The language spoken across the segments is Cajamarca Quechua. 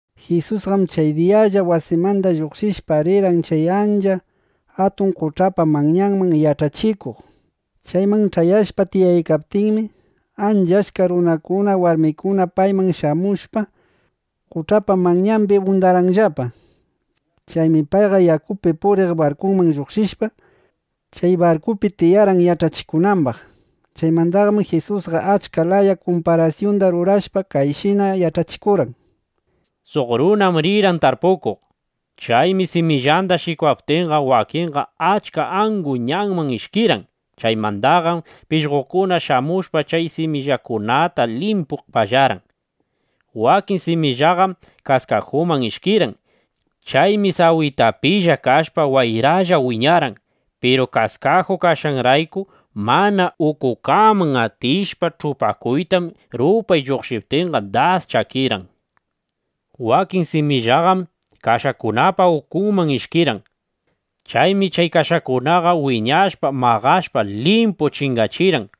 Jisusqam chay diyalla wasimanda lluqshishpa, rirqan chay ancha atun qoch'apa manyanman yach'achikuq. Chayman ch'ayashpa tiyaykaptinmi, ancha achka runakuna, warmikuna payman shamushpa, qoch'apa manyambi undarqanllapa. Chaymi payqa yakupi puriq barkuman lluqshishpa, chay barkupi tiyarqan yach'achikunambaq. Chaymandaqam Jisusqa achka laya kumparasyunda rurashpa, kayshina yach'achikurqan: —Suq runam rirqan tarpukuq. Chaymi simillanda shikwaptinqa, wakinqa ancha angu ñanman ishkirqan. Chaymandaqam pishqokuna shamushpa, chay simillakunata limpu pallarqan. Wakin simillaqam kaskajuman ishkirqan. Chaymi sawitapilla kashpa, wayralla wiñarqan. Piru kaskaju kashqanrayku mana ukukaman atishpa ch'upakuytam, rupay lluqshiptinqa, das chakirqan. Wakin simillaqam kashakunapa ukunman ishkirqan. Chaymi chay kashakunaqa wiñashpa, maqashpa limpu chingachirqan.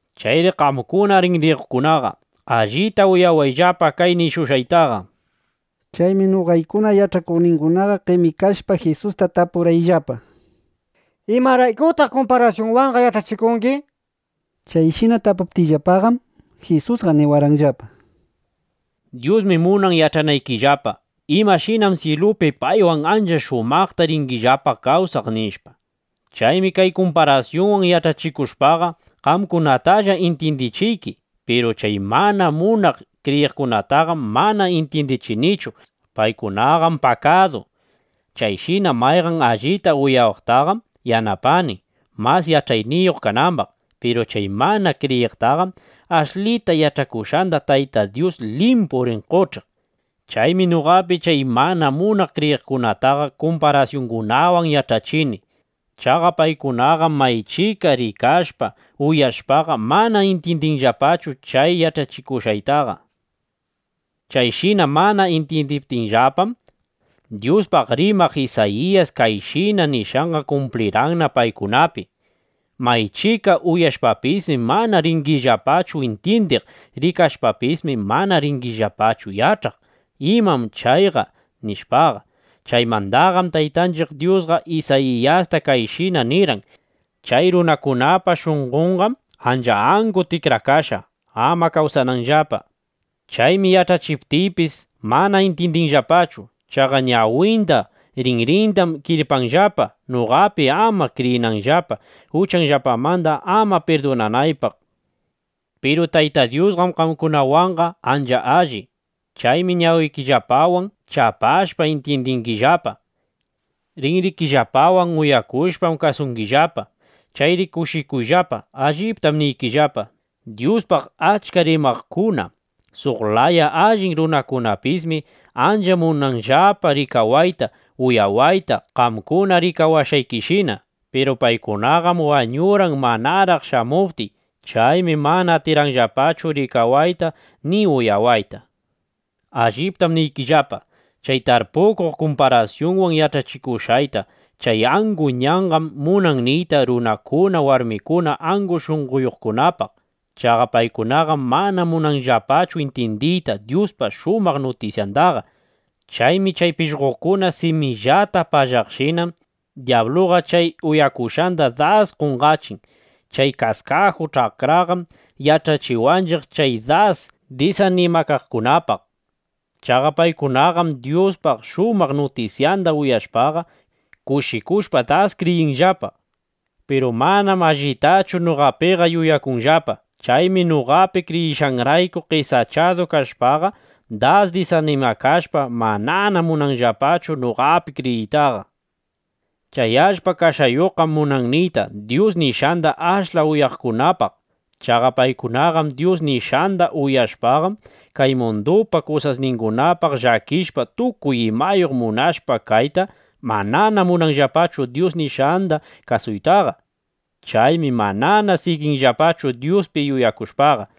¡Chayri qamkuna rinriyuqkunaqa allita uyawayllapa kay nishushqayta! Chaymi noqaykuna yach'akuqninguna qemikashpa, Jisusta tapurqayllapa: —¿Imaraykutaq kumparasyunwanqa yach'achikungi? nishpa. Chayshina tapuptiyllapaqam, Jisusqa niwarqanllapa: —Dyusmi munan yach'anaykillapa imashinam syilupi paywan ancha shumaqta ringillapa kawsaq, nishpa. Chaymi kay kumparasyungunawan yach'achikushpaqa, qamkunatalla intyindichiyki. Piru chay mana munaq kriyiqkunataqam mana intyindichinichu. Paykunapaqqam pakadu. Chayshina mayqan allita uyawaqtaqam yanapani, mas yach'ayniyuq kanambaq. Piru chay mana kriyiqtaqam ashlita yach'akushqanda Taytay Dyus limpu rin qoch'iq. Chaymi noqapi chay mana munaq kriyiqkunataqa kumparasyungunawan yach'achini. Chaqa paykunaqam maychika rikashpa uyashpaqa, mana intyindinllapachu chay yach'achikushqayta. Chayshina mana intyindiptinllapam, Dyuspaq rimaq Isayiyas kayshina nishqanqa kumpliykanna paykunapi: Maychika uyashpapismi, mana ringillapachu intyindiq. Rikashpapismi, mana ringillapachu yach'aq: imam chayqa, nishpaqa. (Chaymandaqam Taytanchiq Dyusqa Isayiyasta kayshina nirqan:) Chay runakunapa shunqonqam ancha angu tikrakashqa, ama kasuwananllapa. Chaymi yach'achiptiypis, mana intyindinllapachu. Chaqa ñawinda, rinrindam kirpanllapa, noqapi ama kriyinanllapa, uchanllapamanda ama pirdunanaypaq, nishpa. ’Piru Tayta Dyusqam qamkunawanqa ancha alli. Chaymi ñawikillapawan chapashpa, intyindingillapa. Rinrikillapawan uyakushpam kasungillapa. Chayri kushikuyllapa. Alliptam niykillapa, Dyuspaq achka rimaqkuna, suq laya allin runakunapismi ancha munarqanllapa rikawayta, uyawayta qamkuna rikawashqaykishina. Piru paykunaqam wañurqan manaraq shamuptiy. Chaymi mana atirqanllapachu rikawayta ni uyawayta. ’Alliptam niykillapa, chay tarpukuq kumparasyunwan yach'achikushqayta. Chay angu ñanqam munan niyta runakuna, warmikuna angu shunqoyuqkunapaq. Chaqa paykunaqam mana munanllapachu intyindiyta Dyuspa shumaq nutisyandaqa. Chaymi chay pishqokuna simillata pallaqshinam dyabluqa chay uyakushqanda das qonqachin. Chay kaskaju ch'akraqam yach'achiwanchiq chay das disanimakaqkunapaq. Chaqa paykunaqam Dyuspa shumaq nutisyanda uyashpaqa, kushikushpa das kriyinllapa. Piru manam allitachu noqapiqa yuyakunllapa. Chaymi noqapi kriyishqanrayku qesachadu kashpaqa, das disanimakashpa, manana munanllapachu noqapi kriyiytaqa. Chay allpa kashayuqqam munan niyta Dyus nishqanda ashla uyaqkunapaq. Chaqa paykunaqam Dyus nishqanda uyashpaqam, kay mundupa kusasningunapaq llakishpa, tukuy imayuq munashpa kayta, manana munanllapachu Dyus nishqanda kasuytaqa. Chaymi manana siginllapachu Dyuspi yuyakushpaqa.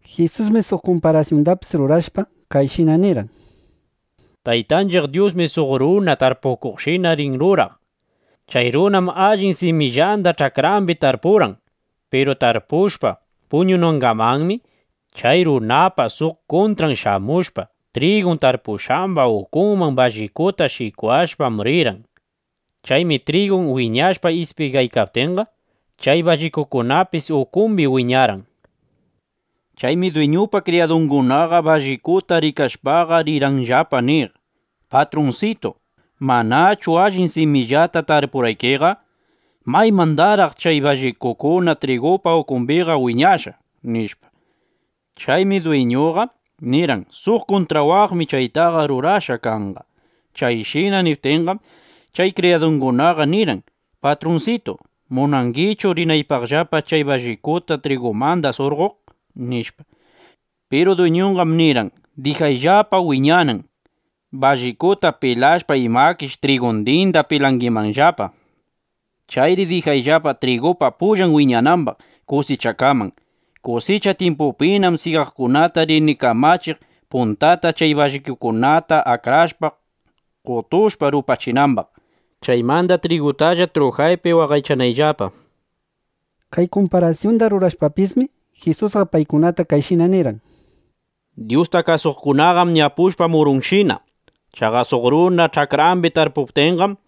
Jisusmi suq kumparasyundapis rurashpa, kayshina nirqan: —Taytanchiq Dyusmi suq runa tarpukuqshina rin ruraq. Chay runam allin simillanda ch'akrambi tarpurqan. Piru tarpushpa puñunangamanmi, chay runapa suq kuntran shamushpa, trigun tarpushqamba ukunman ballikuta shikwashpa rirqan. Chaymi trigun wiñashpa, ispigaykaptinqa, chay ballikukunapis ukumbi wiñarqan. Chaymi dwiñupa kriyadungunaqa ballikuta rikashpaqa, rirqanllapa niq: “Patrunsitu, ¿manachu allin simillata tarpurqaykiqa? ¿Maymandaraq chay ballikukuna trigupa ukumbiqa wiñashqa?” nishpa. Chaymi dwiñuqa nirqan: “Suq kuntrawaqmi chaytaqa rurashqa kanqa.” Chayshina niptinqam, chay kriyadungunaqa nirqan: “Patrunsitu, ¿munangichu rinaypaqllapa, chay ballikuta trigumanda surqoq?” nishpa. Piru dwiñunqam nirqan: “Dijayllapa wiñanan. Ballikuta pilashpa, imakish trigundinda pilangimanllapa. Chayri dijayllapa trigupa pullan wiñanambaq kusichakaman. Kusicha tyimpupinam syigaqkunata rini kamachiq, puntata chay ballikukunata akrashpa, qotushpa, rupachinambaq, chaymanda trigutalla trujaypi waqaychananllapa”, nishpa. Kay kumparasyunda rurashpapismi, Jisusqa paykunata kayshina nirqan: —Dyusta kasuqkunaqam ñapushpa murunshina. Chaqa suq runa ch'akrambi tarpuptinqam,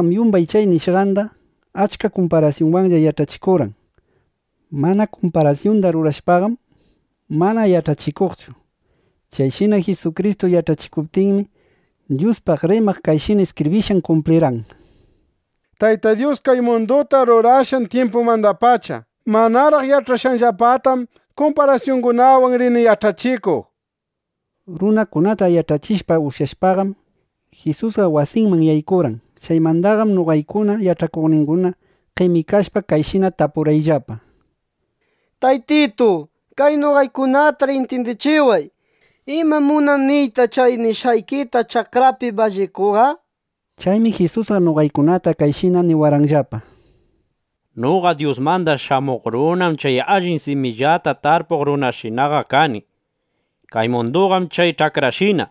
Jisusqam yumbay chay nishqanda achka kumparasyunwanlla yach'achikurqan. Mana kumparasyunda rurashpaqam, mana yach'achikuqchu. Chayshina Jisukristu yach'achikuptinmi, Dyuspaq rimaq kayshina iskibrishqan kumplirqan: Tayta Dyus kay munduta rurashqan tyimpumandapacha manaraq yach'ashqanllapatam kumparasyungunawan rini yach'achikuq, nishpa. Runakunata yach'achishpa ushyashpaqam, Jisusqa wasiman yaykurqan. Chaymandaqam noqaykuna yach'akuqninguna qemikashpa kayshina tapurqayllapa: —Taytitu, kay noqaykunatar intyindichiway ¿imam munan niyta chay nishqayki ch'akrapi ballikuqa? nishpa. Chaymi Jisusqa noqaykunata kayshina niwarqanllapa: —Noqa Dyusmanda Shamuq Runam chay allin simillata tarpuq runashinaqa kani. Kay munduqam chay ch'akrashina.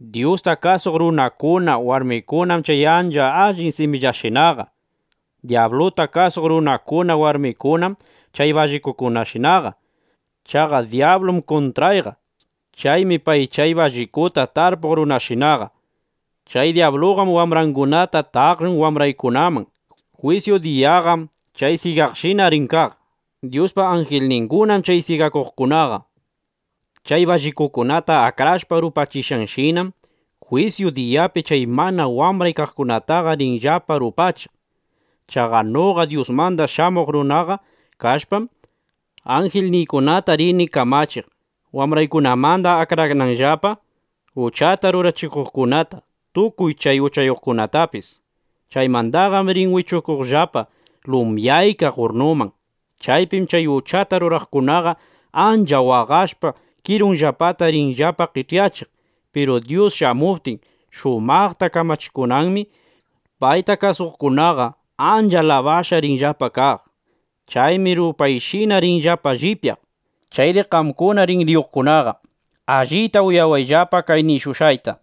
Dyusta kasuq runakuna, warmikunam chay allin simillashinaqa. Dyabluta kasuq runakuna, warmikunam chay ballikushinaqa. Chaqa dyablum kuntrayqa. Chaymi pay chay ballikuta tarpuq runashinaqa. Chay dyabluqam wambrangunata taqllun wambraykunaman. Jwisyu diyaqam chay syigashina rin kaq. Dyuspa anjilningunam chay syigakuqkunaqa. Chay ballikukunata akrashpa rupachishqanshinam, jwisyu diyapi chay mana wambray kaqkunataqa rinllapa rupachiq. Chaqa noqa Dyusmanda Shamuq Runaqa kashpam, anjilniykunata rini kamachiq, wambraykunamanda akrananllapa uchata rurachikuqkunata, tukuy chay uchayuqkunatapis. Chaymandaqam rin wichuqllapa lumyaykaq urrnuman. Chaypim chay uchata ruraqkunaqa ancha waqashpa, kirunllapata rinllapa qech'yachiq. Piru Dyus shamuptin, shumaqta kamachikunanmi, payta kasuqkunaqa ancha alabashqa rinllapa kaq. Chaymi rupayshina rinllapa llipyaq. Chayri qamkuna rinriyuqkunaqa, allita uyayllapa kay nishushqayta.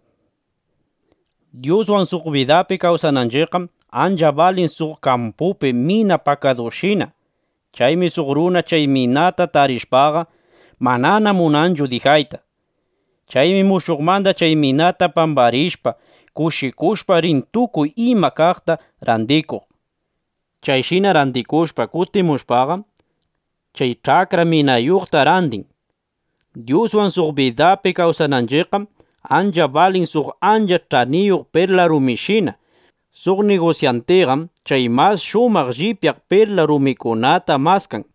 ’Dyuswan suq bidapi kawsananchiqqam ancha balin suq kampupi mina pakadushina. Chaymi suq runa chay minata tarishpaqa, manana munanchu dijayta. Chaymi mushuqmanda chay minata pambarishpa, kushikushpa rin tukuy iman kaqta randikuq. Chayshina randikushpa, kutimushpaqam, chay ch'akra minayuqta randin. ’Dyuswan suq bidapi kawsananchiqqam ancha balin suq ancha ch'aniyuq perla rumishina. Suq nigusyantiqam chay mas shumaq llipyaq perlas rumikunata maskan.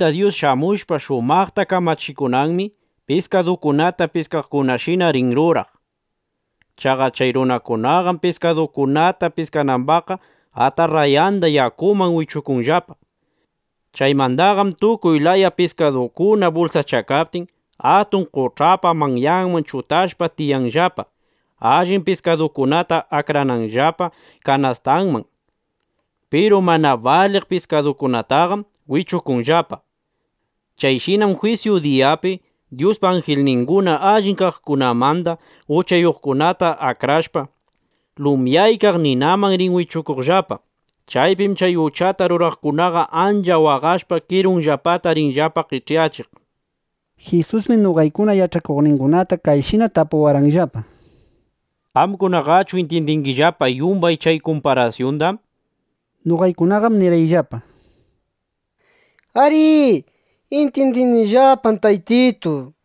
’Tayta Dyus shamushpa shumaqta kamachikunanmi, piskadukunata piskaqkunashina rin ruraq. Chaqa chay runakunaqam piskadukunata piskanambaqqa, atarrayanda yakuman wichukunllapa. Chaymandaqam tukuy laya piskadukuna bulsachakaptin, atun qoch'apa manyanman chutashpa tiyanllapa, allin piskadukunata akrananllapa kanastanman. Piru mana baliq piskadukunataqam wichukunllapa. Chayshinam jwisyu diyapi Dyuspa anjilninguna allin kaqkunamanda uchayuqkunata akrashpa, lumyaykaq ninaman rin wichukuqllapa. Chaypim chay uchata ruraqkunaqa ancha waqashpa kirunllapata rinllapa qech'yachiq. Jisusmi noqaykuna yach'akuqningunata kayshina tapuwarqanllapa: —¿Qamkunaqachu intyindingillapa yumbay chay kumparasyunda? nishpa. Noqaykunaqam nirqanillapa: —Arí, intyindinillapam, Taytitu, nishpa.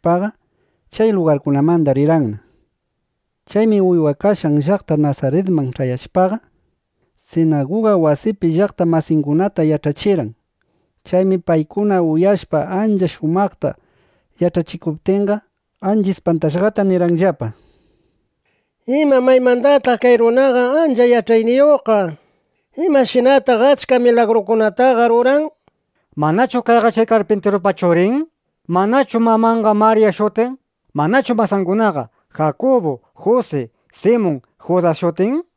Jisusqam chay kumparasyungunawan yach'achikushpaqa, chay lugarmandaqa rirqanna. Chaymi uywakashqan llaqta Nasaritman ch'ayashpaqa, sinaguga wasipi llaqta masingunata yach'achirqan. Chaymi paykuna uyashpa ancha shumaqta yach'achikuptinqa, ancha ispantashqata nirqanllapa: —¿Ima, maymandataq kay runa ancha yach'ayniyuqqa? ¿Imashinataq achka milagrukunataqa ruran? ¿Manachu kayqa chay karpintirupa churin? ¿Manachu mamanqa Marya shutin? ¿Manachu masangunaqa Jakubu, Jusi, Simun, Judas shutin?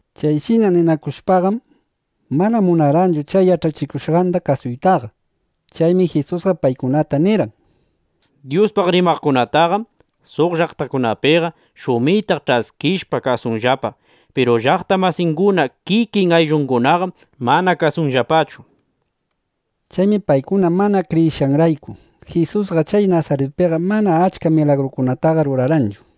Chayshina ninakushpaqam, mana munarqanllapachu chay yach'achikushqanda kasuytaqa. Chaymi Jisusqa paykunata nirqan: —Dyuspaq rimaqkunataqam suq llaqtakunapiqa shumitaq ch'askishpa kasunllapa. Piru llaqta masinguna, kikin ayllungunaqam mana kasunllapachu, nishpa. Chaymi paykuna mana kriyishqanrayku, Jisusqa chay Nasaritpiqa mana achka milagrukunataqa rurarqanchu.